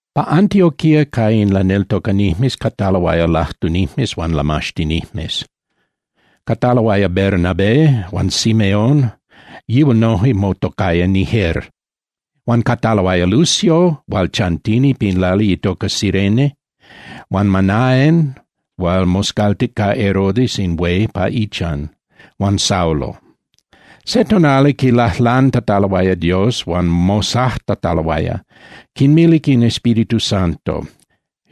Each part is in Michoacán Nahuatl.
Pa Antioquía ca in laneltocanijmes cataloaya lajtunijmes huan lamaxtinijmes. Cataloaya Bernabé huan Simeón, yihual noje motocaya Niger, huan cataloaya Lucio hual chantini pin lali itoca Cirene, huan Manaen hual moscaltic ca Herodes in hué pa ichan, huan Saulo. Se tonali quilajlantataloaya Dios huan mosajtataloaya, quinmilic in Espíritu Santo: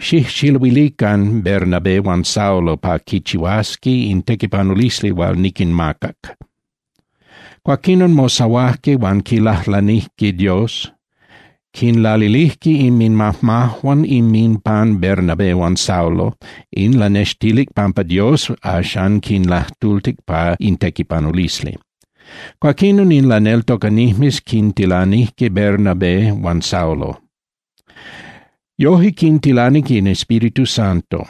—Xijxiluilican Bernabé huan Saulo pa quichihuasqui in tequipanulisli hual niquinmacac. Cuaquinon, mosahuajque huan quilajlanijque Dios, quinlalilijque inminmajmajuan inminpan Bernabé huan Saulo. In lanextilic pampa Dios axan quinlajtultic pa in tequipanulisli. Cuaquinon in laneltocanijmes quintilanijque Bernabé huan Saulo. Yojque quintilanic in Espíritu Santo.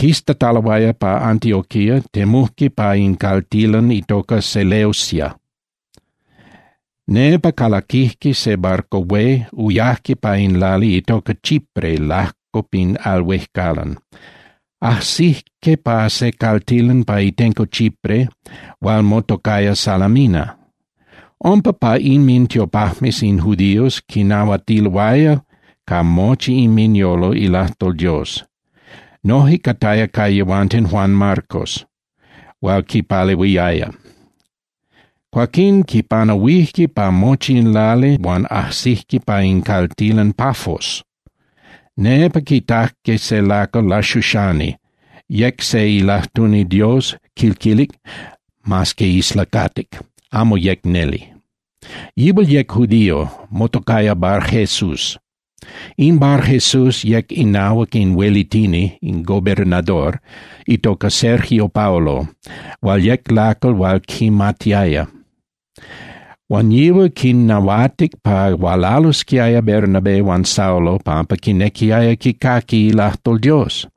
Quistataloaya pa Antioquía, temujque pa in caltilan itoca Seleucia. Nepa calaquijque se barco hué, uyajque pa in lali itoca Chipre lajco pin al huejcalan. Ajsijque pa se caltilan pa itenco Chipre hual motocaya Salamina. Umpa pa inmintiopajmes in judíos quinahuatiloaya ca mochi inminyolo ilajtol Dios. Noje cataya ca yehuanten Juan Marcos hual quinpalehuiaya. Cuaquín quipanahuijque pa mochi in lali huan ajsijque pa in caltilan Pafos. Nepa quitajque se lacal laxuxani, yec se ilajtuni Dios, quil quilic, mas que islacatic, amo yec neli. Yihual yec judío, motocaya Barjesús. In Barjesús yec inahuac in huelitini (gobernador) itoca Sergio Paulo hual yec lacal hual quimatiaya, huan yihual quinnahuatic pa hualalosquiaya Bernabé huan Saulo pampa quinequiaya quicaqui ilajtol Dios.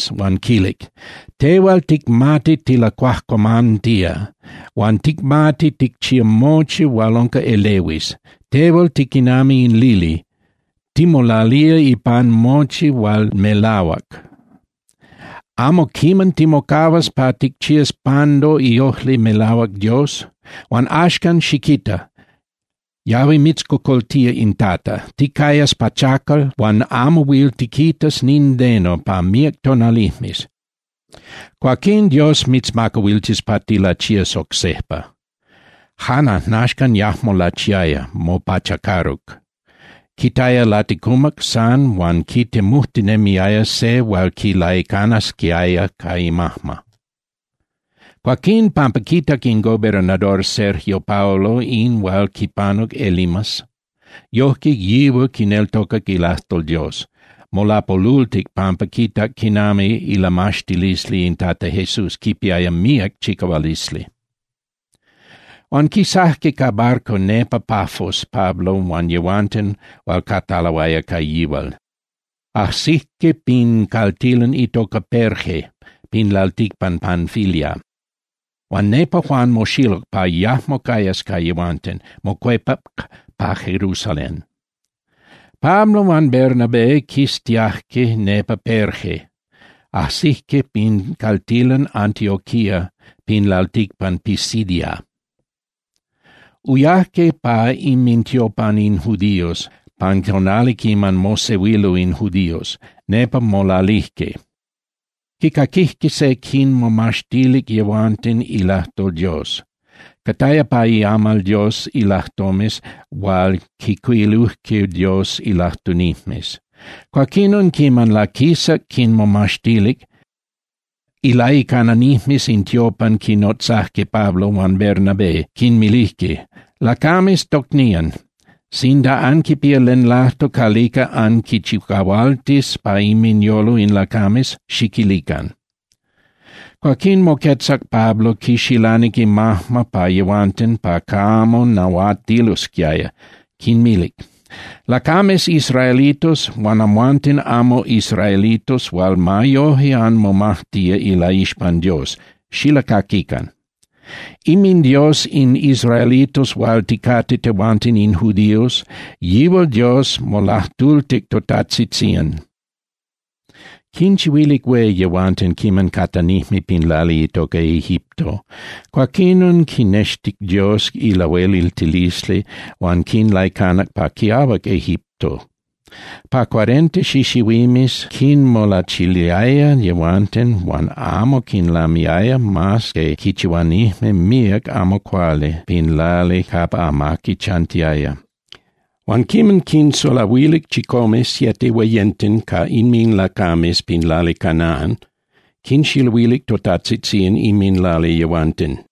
huan quilic: —Tehual ticmati tilacuajcuamantía huan ticmati ticchía mochi hual unca elehuis. Tehual tiquinami in lili, timolalía ipan mochi hual melahuac. ¿Amo quiman timocahuas pa ticchías pando iojli melahuac Dios? Huan axcan, xiquita. Yahui mitzcocoltía in Tata. Ticayas pachacal huan amo huil tiquitas nindeno pa míac tonalijmes. Cuaquín Dios mitzmacahuiltis pa tilachías oc sejpa. Jan ajnaxcan, yajmo lachiaya, mopachacaruc. Quitaya laticumac san huan quitemujtinemiaya se hual quilaicanasquiaya ca imajma. Cuaquín pampa quitac in gobernador Sergio Paulo in hual quipanuc Elimas, yojque yihual quineltocac ilajtol Dios, molapolultic pampa quitac quinami ilamaxtilisli in Tata Jesús quipiaya míac chicahualisli. Huan quisajque ca barco nepa Pafos Pablo huan yehuanten hual cataloaya ca yihual, ajsijque pin caltilan itoca Perge pin lalticpan Panfilia. Huan nepa Juan moxiluc pa yajmo cayas ca yehuanten, mocuepac pa Jerusalén. Pablo huan Bernabé quistiajque nepa Perge, ajsijque pin caltilan Antioquía pin lalticpan Pisidia. Uyajque pa inmintiopan in judíos pan tonali quiman mosehuilo in judíos, nepa molalijque. Quicaquijque se quinmomaxtilic yehuanten ilajtol Dios. Cataya pa iamal Dios ilajtomes hual quijcuilujque Dios ilajtunijmes. Cuaquinon, quiman laquisac quinmomaxtilic, ilaicananijmes in tiopan quinnotzajque Pablo huan Bernabé, quinmilijque: —Lacames tocnían, sinda anquipía len lajtol calica anquinchicahualtis pa inminyolo in lacames, xiquilican. Cuaquín moquetzac Pablo, quixilanic imajma pa yehuanten pa camo nahuatilosquiaya, quinmilic: —Lacames israelitos huan amhuanten amo israelitos hual ma yoje anmomajtía ilaixpan Dios, xilacaquican. InminDios in israelitos hual ticate tehuanten in judíos, yihual Dios molajtultilic totajtzitzían. Quinchihuilic hué yehuanten quiman catanijme pin lali itoca Egipto. Cuaquinon quinextic Dios ilahueliltilisli huan quinlaicanac pa quiahuac Egipto. Pa cuarenta xixihuimes quinmolachiliaya yehuanten huan amo quinlamiaya mas que quichihuanijme míac amo cuali pin lali capa amaqui chantiaya. Huan quiman quinsulahuilic chicome (siete) hueyenten ca inminlacames pin lali Canaan, quinxiluilic totajtzitzían inminlali yehuanten.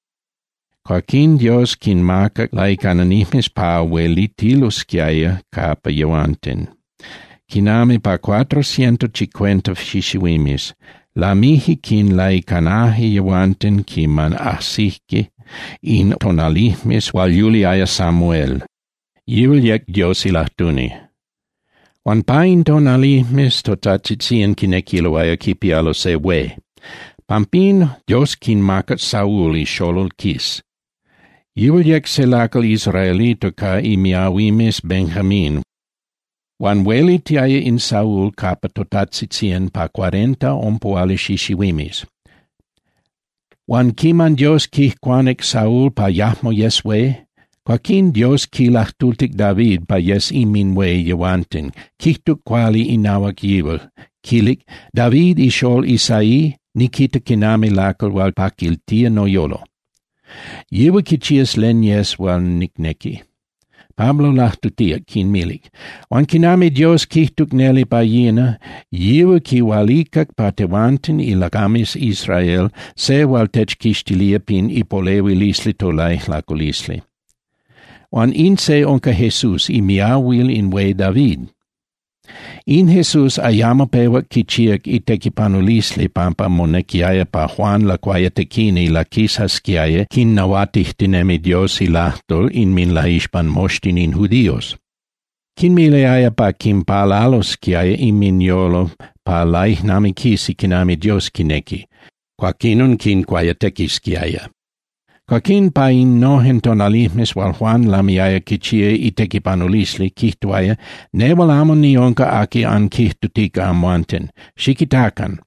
Cuaquín Dios quinmacac laicananijmes pa huelitilosquiaya capa yehuanten quinami pa cuatro ciento cincuenta xixihuimes. Lamije quinlaicanaje yehuanten quiman ajsije in tonalijmes hual yuliaya Samuel, yihual yec Dios ilajtuni. Huan pa in tonalijmes totajtzitzían quinequiloaya quipialo se hué. Pampín, Dios quinmacac Saúl ixolol Cis. Yihual yec se lacal israelito ca imiahuimes Benjamín, huan huelitiaya in Saúl capa totajtzitzían pa cuarenta (ompuhuali) xixihuimes. Huan quiman Dios quijcuanic Saúl pa yajmo yes hué, cuaquín Dios quilajtultic David pa yes inminhué yehuanten, quijtuc cuali inahuac yihual, quilic: “David ixolol Isaí niquita quinami lacal hual quipaquiltía noyolo, yihual quichías len yes hual nicnequi.” Pablo lajtutíac, quinmilic: —Huan quinami Dios quijtuc neli pa yina, yihual quihualicac pa tehuanten ilacames Israel se hual techquixtilía pin ipolehuilisli tolaijlaculisli. Huan in se unca Jesús imiahuil in hué David. In Jesús ayamo pehuac quichíac itequipanulisli pampa monequiaya pa Juan Lacuayatequini laquisasquiaya quinnahuatijtinemi Dios ilajtol inminlaixpan moxtin in judíos. Quinmiliaya pa quinpalalosquiaya inminyolo pa laijnamiquisi quinami Dios quinequi, cuaquinon quincuayatequisquiaya. Cuaquín pa innojen tonalijmes hual Juan lamiaya quichía itequipanulisli, quijtuaya: “Nehual amo niunca aqui anquijtutica amhuanten. Xiquitacan.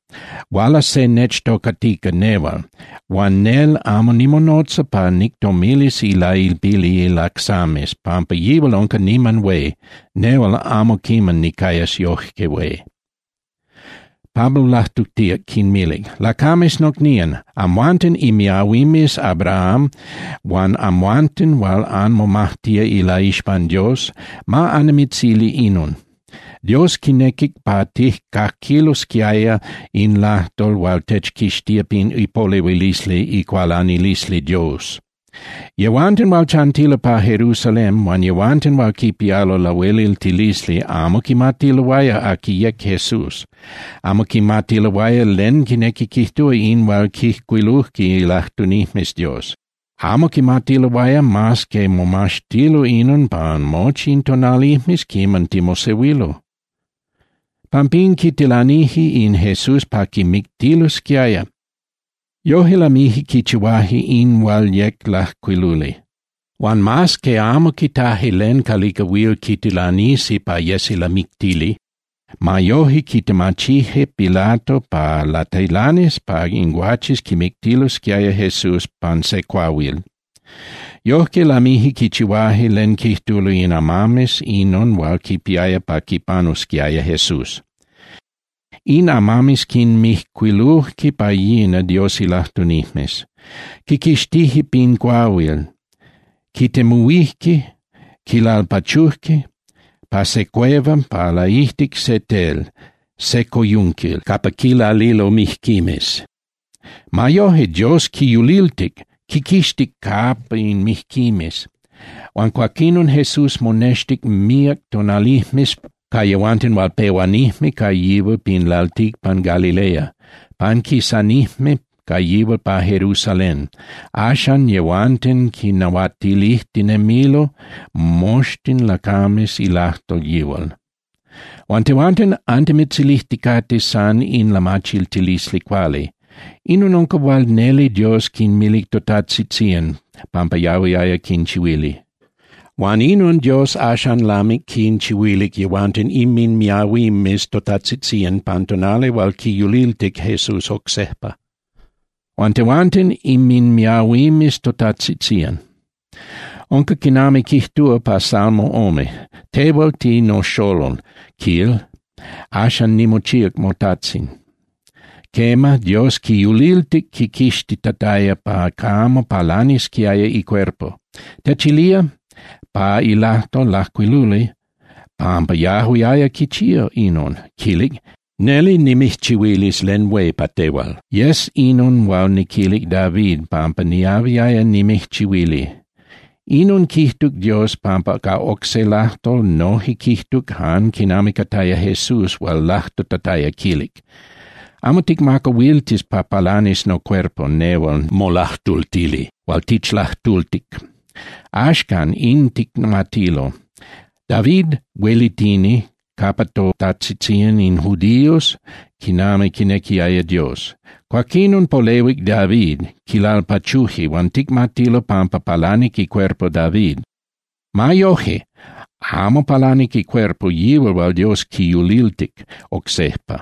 Hualas se nechtocatica nehual, huan nel amo nimonotza pa nictomilis ilailpili ilacsames pampa yihual unca niman hué, nehual amo quiman nicayas yoje hué.” Pablo lajtutíac, quinmilic: —Lacames nocnían, amhuanten imiahuimes Abraham huan amhuanten hual anmomajtía ilaixpan Dios, ma annimitzili inon. Dios quinequic pa tijcaquilosquiaya in lajtol hual techquixtía pin ipolehuilisli icualanilisli Dios. Yehuanten hual chantilo pa Jerusalén, huan yehuanten hual quipialo lahueliltilisli amo quimatiloaya aqui yec Jesús. Amo quimatiloaya len quinequi quijtúa in hual quijcuiluje ilajtunijmes Dios. Amo quimatiloaya mas que momaxtilo inon pan mochi in tonalijmes quiman timosehuilo. Pampín quitilanije in Jesús pa quimictilosquiaya, yoje lamije quichihuaje in hual yec lajcuiluli. Huan mas que amo quitaje len calica huil quitilanisi pa yesi lamictili, ma yoje quitemachije Pilato pa latilanis pa in guaches quimictilosquiaya Jesús pan se cuahuil. Yojque lamije quichihuaje len quijtulo in amames inon hual quipiaya pa quipanusquiaya Jesús. In amames quinmijcuiluje pa yina Dios ilajtunijmes. Quiquixtije pin cuahuil, quitemuhuije, quilalpachuje pa se cueva pa laijtic se tel, se coyunquil capa quilalilo mijquimes. Ma yoje, Dios quiyuliltic, quiquixtic capa in mijquimes. Huan cuaquinon Jesús monextic míac tonalijmes ca yehuanten hual pehuanijme ca yihual pin lalticpan Galilea, panquisanijme ca yihual pa Jerusalén. Axan yehuanten quinnahuatilijtinemilo moxtin lacames ilajtol yihual. Huan tehuanten antimitzilijticate san in lamachiltilisli cuali. Inon unca hual neli Dios quinmilic totatzitzían pampa yahuiaya quinchihuili. Huan inon Dios axan lamic quinchihuilic yehuanten inminmiahuimes totatzitzían pan tonali hual quiyuliltic Jesús oc sejpa. Huan tehuanten inminmiahuimes totatzitzían. Unca quinami quijtúa pa salmo ome: “Tehual tinoxolol”, quil, “axan nimochíac motajtzin.” Quema, Dios quiyuliltic quiquixtitataya pa camo palanisquiaya icuerpo. Techilía pa ilajtol lajcuiluli pampa yahuiaya quichía inon, quilic: “Neli nimijchihuilis len hué pa tehual, yes inon hual niquilic David pampa niahuiaya nimijchihuili.” Inon quijtuc Dios, pampa ca oc se ilajtol noje quijtuc jan quinami cataya Jesús hual lajtutataya, quilic: “Amo ticmacahuiltis pa palanis nocuerpo nehual molajtultili hual tichlajtultic.” Axcan in ticmatilo. David huelitini capa totajtzitzían in judíos quinami quinequiaya Dios. Cuaquinon polehuic David, quilalpachuje huan ticmatilo pampa palanic icuerpo David. Ma yoje, amo palanic icuerpo yihual hual Dios quiyuliltic oc sejpa.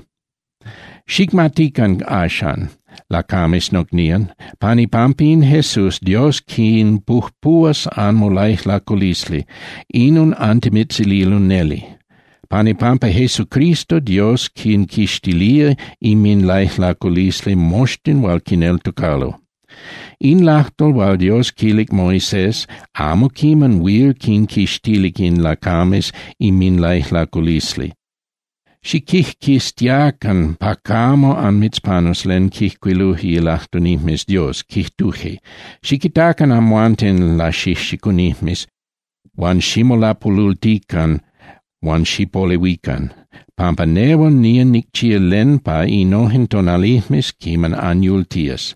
Xicmatican axcan, lacames nocnían, pan ipampa in Jesús Dios quinpujpuhuas anmolaijlaculisli, inon antimitzililo neli. Pan ipampa Jesucristo, Dios quinquixtilía inminlaijlaculisli moxtin hual quineltocalo. In lajtol hual Dios quilic Moisés amo quiman huil quinquixtilic in lacames inminlaijlaculisli. Xiquijquiztiacan pa camo anmitzpanus len quijcuiluje ilajtunijmes Dios, quijtuje: Xiquitacan amhuanten laxijxicunijmes, huan ximolapolultican huan xipolehuican, pampa nehual nía nicchía len pan innojen tonalijmes quiman anyultías.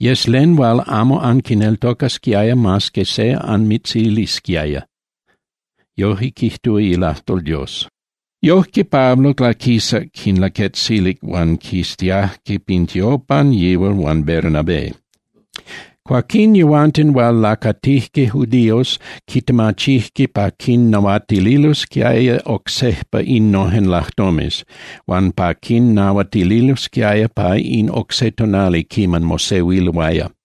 Yes len hual amo anquineltocasquiaya mas que se anmitzilisquiaya. Yojque quijtúa ilajtol Dios. Yojque Pablo laquisac quinlaquetzilic huan quistiajque pin tiopan yihual huan Bernabé. Cuaquín yehuanten hual lacatijque judíos quitemachijque pa quinnahuatililosquiaya oc sejpa innojen lajtomes, huan pa quinnahuatililosquiaya pa in oc se tonali quiman mosehuiloaya.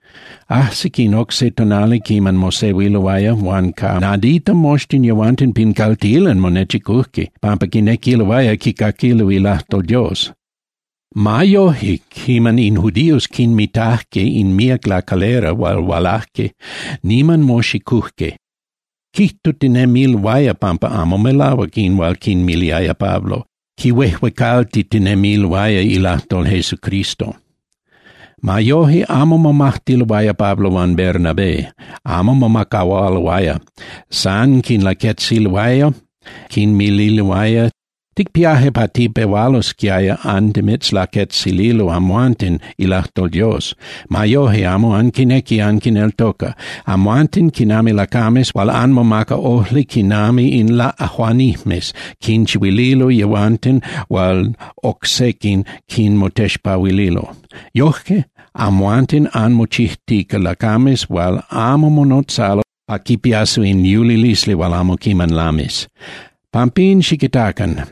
Ajsic in oc se tonali quiman mosehuiloaya, huan ca nadita moxtin yehuanten pin caltilan monechicujque, pampa quinequiloaya quicaquilo ilajtol Dios. Ma yoje, quiman in judíos quinmitajque in míac lacalera hual hualajque, niman moxicujque, quijtutinemiloaya pampa amo melahuac in hual quinmiliaya Pablo, quihuejuecaltitinemiloaya ilajtol Jesucristo. Ma yoje amo momajtiloaya Pablo huan Bernabé, amo mocahualoaya. San quinlaquetzililoaya, quinmililoaya: —Ticpiaje pa tipehualosquiaya antimitzlaquetzililo amhuanten ilajtol Dios. Ma yoje amo anquinequi anquineltoca. Amhuanten quinami lacames hual anmomaca ojli quinami in laꞌajuanijmes quinchihuililo yehuanten hual oc sequin quinmotexpahuililo. Yoje amhuanten anmochijtica lacames hual amo monotzalo pa quipiasi in yulilisli hual amo quiman lamis. Pampín xiquitacan.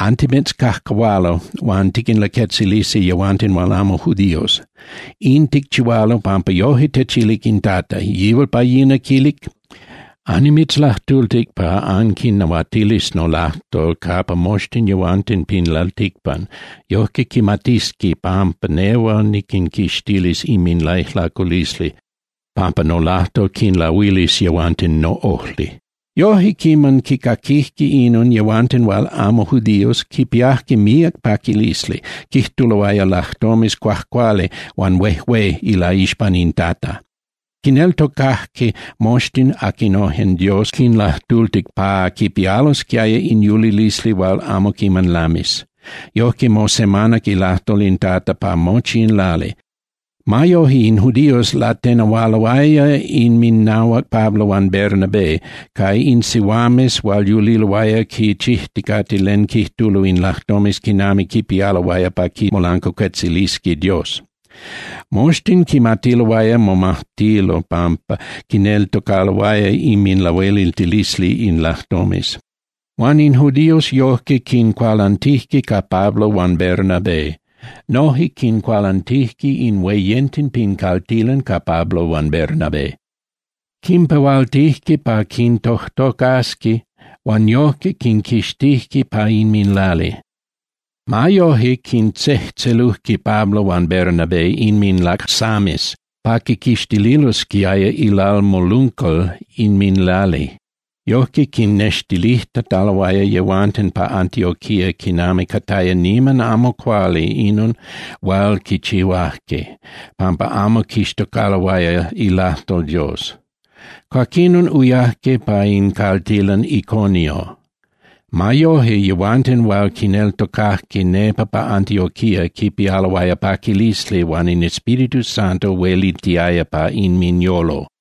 Antimitzcajcahualo huan tiquinlaquetzilisi yehuanten hual amo judíos. In ticchihualo pampa yojque techilic in Tata. Yihual pa yina quilic: Annimitzlajtultic pa anquinnahuatilis nolajtol capa moxtin yehuanten pin lalticpan, yojque quimatisqui pampa nehual niquinquixtilis inminlaijlaculisli, pampa nolajtol quinlahuilis yehuanten noꞌojli. Yoje, quiman quicaquijque inon yehuanten hual amo judíos, quipiajque míac paquilisli, quijtuloaya lajtomes cuajcuali huan huejué ilaixpan in Tata. Quineltocajque moxtin aquinojen Dios quinlajtultic pa quipialosquiaya in yulilisli hual amo quiman lamis. Yojque mosemanac ilajtol in Tata pa mochi in lali. Ma yoje in judíos latenehualoaya inminahuac Pablo huan Bernabé ca in sihuames hual yuliloaya quichijticate len quijtulo in lajtomes quinami quipialoaya pa quimolancuacuetzilisqui Dios. Moxtin quimatiloaya momajtilo pampa quineltocaloaya inminlahueliltilisli in lajtomes. Huan in judíos yojque quincualantijque ca Pablo huan Bernabé. Noje quincualantijque in hueyenten pin caltilan ca Pablo huan Bernabé. Quimpehualtijque pa quintojtocasqui huan yojque quinquixtijque pa inminlali. Ma yoje, quintzejtzelujque Pablo huan Bernabé inminlacsames pa quiquixtililosquiaya ilalmoluncal inminlali. Yojque quinextilijtataloaya yehuanten pa Antioquía quinami cataya niman amo cuali inon hual quichihuajque, pampa amo quixtocaloaya ilajtol Dios. Cuaquinon uyajque pa in caltilan Iconio. Ma yoje yehuanten hual quineltocajque nepa pa Antioquía quipialoaya paquilisli huan in Espíritu Santo huelitiaya pa inminyolo.